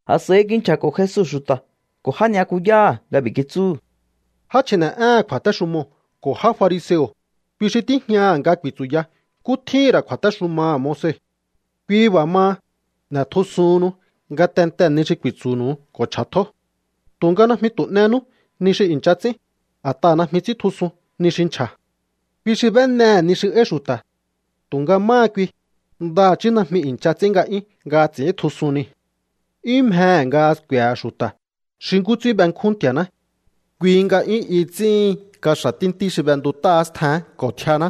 A̱s'a̱i kinchja̱ko̱ Jesu xu̱ta̱ ko̱ já ni'yakuyáha̱ nga b'i̱ kitsúhu̱: —Já chji̱ne̱'éhe̱n kju̱a̱téxumoo̱ ko̱ já fariseo̱, kui xi tíjñaha̱ nga ku̱i̱tsu̱ya nkú tjíhi̱n ra̱ kju̱a̱téxumaha̱ Moise. Kui b'a̱ maha, n'e̱tjusuhunnu ngatentee̱ ni xi ku̱i̱tsu̱hu̱nu̱u ko̱ chj'a̱tjó. Tu̱nga najmi tu̱ n'enú ni xi i̱ncha ts'ín, a̱t'aha̱ najmi ts'íntjusun ni xi nchja̱. Kui xi b'énehe̱ ni xi áí xu̱ta̱, tu̱nga máha kui, ndaha̱chí najmi i̱ncha ts'ín nga'yún nga ts'i̱íntjusun niu̱. ’'Yún mjehe̱ nga sku̱e̱he̱ xu̱ta̱ xi nkú ts'ín benkjún Nti̱a̱ná. Kui nga 'yún i ts'íhin kaxa̱ tíntí xi b'entut'áá stjeén ko̱ tjianá,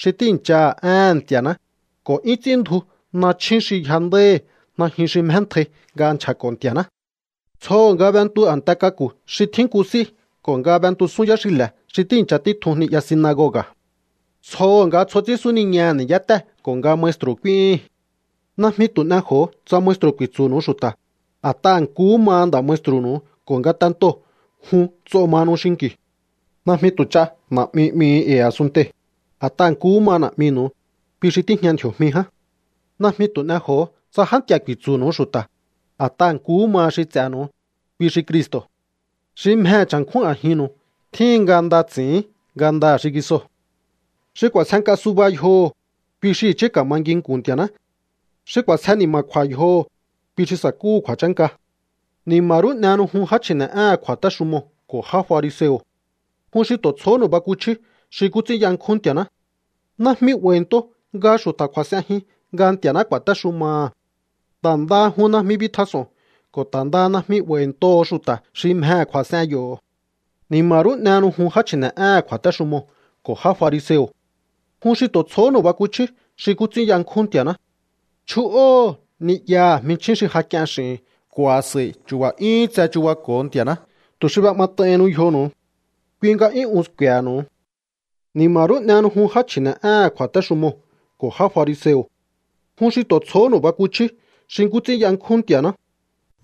xi tíi̱nchaha̱ éhe̱n Nti̱a̱ná, ko̱ 'yún ts'ín ndju nachjún xi yjandáíhi̱ najyun xi mjéntjai nga nchja̱ko̱ Nti̱a̱ná. Tsjoho̱ nga b'entu a̱nte k'aku̱ xi tjín nku s'í ko̱ nga b'entusún yáxile̱ xi tíi̱ncha títjun ni'ya sinagoga̱. Tsjoho̱ nga tsjo ts'ín súniñaha̱ ni̱yátée̱ ko̱ nga maestru̱ k'úíhi̱n. ’Najmi tu̱ n'ej'o̱o tsa maestru̱ ku̱i̱tsu̱nu̱u xu̱ta̱, a̱t'aha̱ nkuhú ma nda̱ maestru̱nu̱u ko̱ ngatentoo̱ jun nts'o mahanu xinki̱u. Najmi tu̱ ch'a na̱'mi 'mihu̱u e̱i̱ a̱sunntei̱, a̱t'aha̱ nkuhú ma Na̱'minu̱u, kui xi tíjña ndji̱o̱jmi ján. Najmi tu̱ n'ej'o̱o tsa já nti̱a̱ ku̱i̱tsu̱nu̱u xu̱ta̱, a̱t'aha̱ nkuhú ma xi ts'e̱nu̱u, kui xi Cristo̱. Xi mjehe̱ cha̱nkjún a̱jinnu̱u tjíhin nga nda ts'i̱ín ngandaha̱ xingisoo̱. Xi k'u̱a̱sjenk'a suba yjoho̱, kui xi i̱chí ka̱ma nginku̱n Nti̱a̱ná. Xi k'u̱a̱sje ni̱ma̱kju̱a̱ yjoho̱, kui xi sa̱kúhu̱ kju̱a̱chánka. ’¡Ni̱ma̱ rú n'ehenu jun, já chji̱ne̱'éhe̱n kju̱a̱téxumoo̱ ko̱ já fariseo̱! ¡Jun xi tu̱ tsjohónu̱u bakuchjíú xi nkú ts'ín yankjún Nti̱a̱ná! Najmi 'ba̱i̱nto nga xu̱ta̱ kju̱a̱s'enjin nga Nti̱a̱ná ku̱a̱téxumaha̱. Ta̱ ndaha jun najmi bitjas'o̱on ko̱ ta̱ ndaha najmi 'ba̱i̱ntoho̱o xu̱ta̱ xi mjehe̱ kju̱a̱s'en yo̱. ’¡Ni̱ma̱ rú n'ehenu jun, já chji̱ne̱'éhe̱n kju̱a̱téxumoo̱ ko̱ já fariseo̱! ¡Jun xi tu̱ tsjohónu̱u bakuchjíú xi nkú ts'ín yankjún Nti̱a̱ná! Chju'óho̱o ni'yaha̱ jminchjín xi ja k'ien x'i̱hi̱n ko̱ a̱s'a̱i chu̱ba̱ 'yúhún tse chu̱bako̱o Nti̱a̱ná tu̱ xi b'é'mat'aihinnu yjonu̱u. Kui nga 'yún un sku̱e̱he̱nu̱u. ’¡Ni̱ma̱ rú n'ehenu jun, já chji̱ne̱'éhe̱n kju̱a̱téxumoo̱ ko̱ já fariseo̱! ¡Jun xi tu̱ tsjohónu̱u bakuchjíú xi nkú ts'ín yankjún Nti̱a̱ná!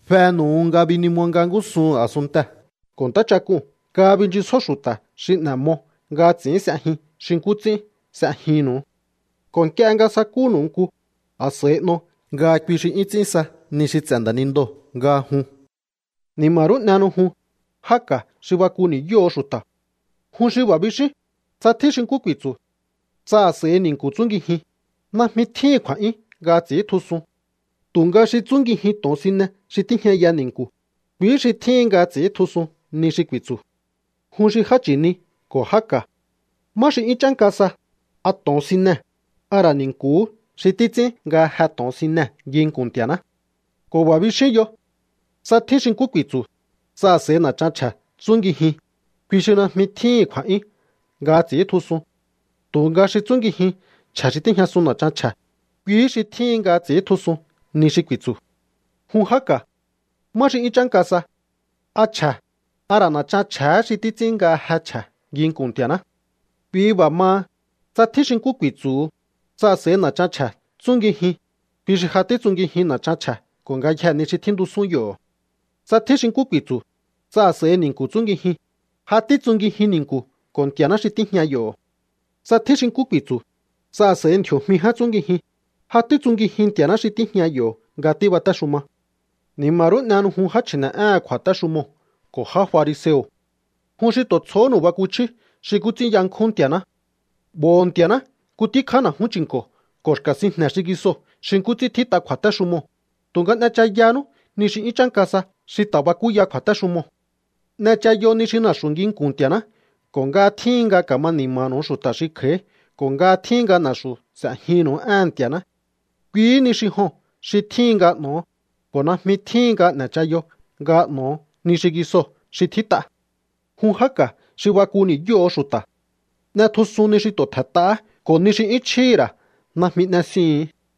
Fenu̱u nga binimo nga ngúsuhu̱n a̱sunntee̱ ko̱ ntáchak'uu̱n nga binchisjó xu̱ta̱ xi n'e̱ mo nga ts'i̱ín s'ejin xi nkú ts'ín s'ejinnu̱u. Ko̱ nk'ie nga ja sakúnu̱u nku, a̱s'a̱i n'o nga kui xi 'yún ts'ín sa ni xi ts'e̱ nda̱nindoo̱ nga jun. ’¡Ni̱ma̱ rú n'ehenu jun, já ka̱ xi baku ni̱yóho̱o xu̱ta̱! Jun xi b'a̱ bixíún: “Tsa tjín xi nkú ku̱i̱tsu̱, tsa a̱s'a̱i ni̱nku̱ tsúngijin, najmi tjíhi̱n kju̱a̱'yún nga ts'i̱íntjusun. Tu̱nga xi tsúngijin to̱onsine xi tíjñaya ni̱nku̱, kuihí xi tjíhin nga ts'i̱íntjusun ni xi ku̱i̱tsu̱.” Jun xi já chi̱ni ko̱ já ka̱. ¿Má xi 'yún chánka sa? ¿A to̱onsinee̱, a ra̱ ni̱nku̱hú xi títs'ín nga je to̱onsinee̱ nginku̱n Nti̱a̱ná? ’Ko̱ b'a̱ bixíún yo: “Tsa tjín xi nkú ku̱i̱tsu̱, tsa a̱s'a̱i na̱chan chje̱ tsúngijin, kui xi najmi tjíhi̱n kju̱a̱'yún nga ts'i̱íntjusun. Tu̱nga xi tsúngijin chje̱ xi tíjñasun na̱chan chje̱, kuihí xi tjíhin nga ts'i̱íntjusun ni xi ku̱i̱tsu̱.” Jun já ka̱. ¿Má xi 'yún chánka sa? ¿A chje̱, a ra̱ na̱chan chje̱hé xi títs'ín nga je chje̱ nginkun Nti̱a̱ná? Kui b'a̱ maha, tsa tjín xi nkú ku̱i̱tsu̱hu, tsa a̱s'a̱i na̱chan chje̱ tsúngijin, kui xi ja títsungijin na̱chan chje̱ ko̱ ngayjee̱ ni xi tjíntusún yo̱. Tsa tjín xi nkú ku̱i̱tsu̱, tsa a̱s'a̱i ni̱nku̱ tsúngijin, ja títsungijin ni̱nku̱ ko̱ Nti̱a̱ná xi tíjña yo̱. Tsa tjín xi nkú ku̱i̱tsu̱, tsa a̱s'a̱i ndji̱o̱jmi ján tsúngijin, ja títsungijin Nti̱a̱ná xi tíjña yo̱ nga tíbatéxuma. ’¡Ni̱ma rú n'ehenu jun, já chji̱ne̱'éhe̱n kju̱a̱téxumoo̱ ko̱ já fariseo̱! ¡Jun xi tu̱ tsjohónu̱u bakuchjíú xi nkú ts'ín yankjún Nti̱a̱ná! 'Bo̱ho̱o Nti̱a̱ná nku tíkjá na̱jún chi̱nko̱ ko̱ xka̱ sinjne̱ xingisoo̱ xi nkú ts'ín tjít'a kju̱a̱téxumoo̱, tu̱nga n'echayanú ni xi 'yún chánka sa xi ta̱ bakúya kju̱a̱téxumoo̱. N'echayo ni xi na̱xu̱ nginku̱n Nti̱a̱ná ko̱ nga tjíhin nga ka̱ma ni̱ma̱nu̱u xu̱ta̱ xi kj'a̱í ko̱ nga tjíhin nga na̱xu̱ s'e̱jinnu̱u éhe̱n Nti̱a̱ná. Kuihí ni xi joo̱n xi tjíhin nga n'o̱o, ko̱ najmi tjíhin nga n'e̱chayo nga n'o̱o ni xingisoo̱ xi tjít'a. ¡Jun já ka̱ xi baku ni̱yóho̱o xu̱ta̱! N'etjusun ni xi tu̱ tje̱nt'ahá ko̱ ni xi 'yún chjíhi̱ ra̱ najmi n'esiuhu̱n.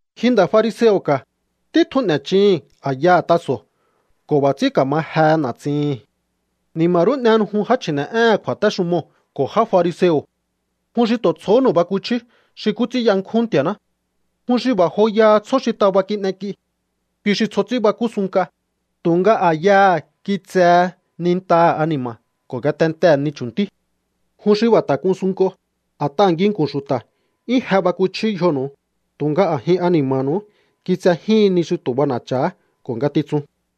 Ji nda̱ fariseo̱ ka̱, títjun n'e̱chihi̱n a̱yaha̱ taso̱ ko̱ b'a̱ ts'ín ka̱ma jehe na̱tsihi̱n. ’¡Ni̱ma̱ rú n'ehenu jun, já chji̱ne̱'éhe̱n kju̱a̱téxumoo̱ ko̱ já fariseo̱! ¡Jun xi tu̱ tsjohónu̱u bakuchjíú xi nkú ts'ín yankjún Nti̱a̱ná! Jun xi b'a̱ joyaha tsjó xi taba kin'ek'i. Kui xi tsjo ts'ín bakú sunnk'a, tu̱nga a̱yaha̱ kitsehe nintaha̱ ani̱ma̱ ko̱ ngatentee̱ ni chu̱ntí. Jun xi b'a̱ ta̱ k'un sunnk'o, a̱t'aha̱ nginku̱n xu̱ta̱ 'yún je bakuchíú yjonu̱u, tu̱nga a̱jin ani̱ma̱nu̱u kitsejíhin ni xi tu̱ b'ana̱cha̱ha ko̱ ngatitsun.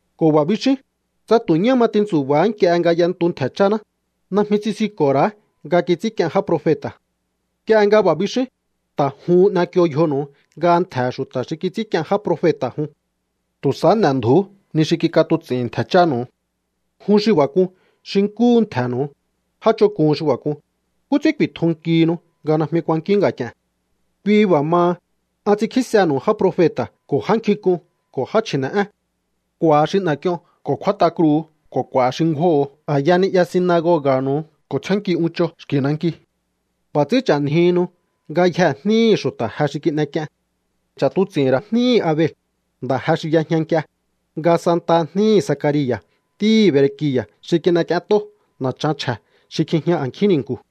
Ko̱ b'a̱ bixíún: “Tsa tu̱ ñá ma ti̱ntsu̱ba̱á nk'ie nga y'entu ntje̱ cháná, najmi tsisinko̱ ra̱á nga kits'ínk'ien já profeta̱.” Nk'ie nga b'a̱ bixíún, ta̱ juhun n'ek'io yjonu̱u nga ntje̱he̱ xu̱ta̱ xi kits'ínk'ien já profeta̱ jun. ¡Tu̱ sahá n'e̱ndju̱ú ni xi kik'atuts'i̱n ntje̱ chánu̱u! ’¡Jun xi b'a̱ k'un xi nkúhu ntje̱nu̱u! ¡Já ch'onk'un xi b'a̱ k'un! ¿Nkú ts'ín ku̱i̱tjunkihinu nga najmi kuankíún nga̱k'i̱e̱n? Kui b'a̱ maha, an ts'inkjísenu̱u já profeta̱ ko̱ já nkjink'un ko̱ já chji̱ne̱'én. K'u̱a̱ xi n'e̱k'ion ko̱ kjúát'a kruu̱ ko̱ k'u̱a̱ xi ngjúóho̱o a̱ya ni'ya sinagoga̱nu̱u ko̱ tsjénnkí'uncho xki̱ nanki. B'a̱ ts'ín ch'a̱njihinu ngayjee̱ jníhi̱ xu̱ta̱ je xi kin'ek'ien. Ch'a̱tuts'i̱hi̱n ra̱ jníhi̱ Abel, nda̱ je xi y'ejña nk'ie, nga santaha jníhi̱ Zacaria̱ ntíhi̱ Berekia̱ xi kin'ek'ient'ó na̱chan chje̱ xi kjijña a̱nkjín ni̱nku̱.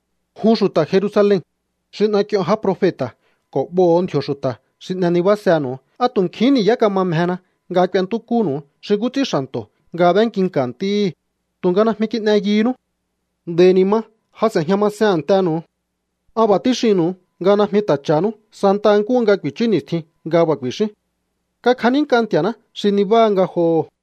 ’¡Jun xu̱ta̱ Jerusalen, xi n'ek'ion já profeta̱ ko̱ b'oho̱o ndji̱o̱ xu̱ta̱ xi n'e nibásenu̱u! ¡A tu̱ nkjihín ni̱yá kama mjena nga k'uentúkúnu̱u xi nkú ts'ín xa̱nto̱ nga b'énkinka̱ ntíhí, tu̱nga najmi kin'e yunú! Nd'a̱i̱ ni̱ ma, ja s'e̱jña masen a̱ntenu̱u. An b'a̱ tíxinnu̱u nga najmi ta̱ cha̱hanú santa nkúhu nga ku̱i̱chú ni̱stjin nga b'a̱ ku̱i̱xíún: “Kakjanínk'a Nti̱a̱ná xi nibáha ngajoho̱.”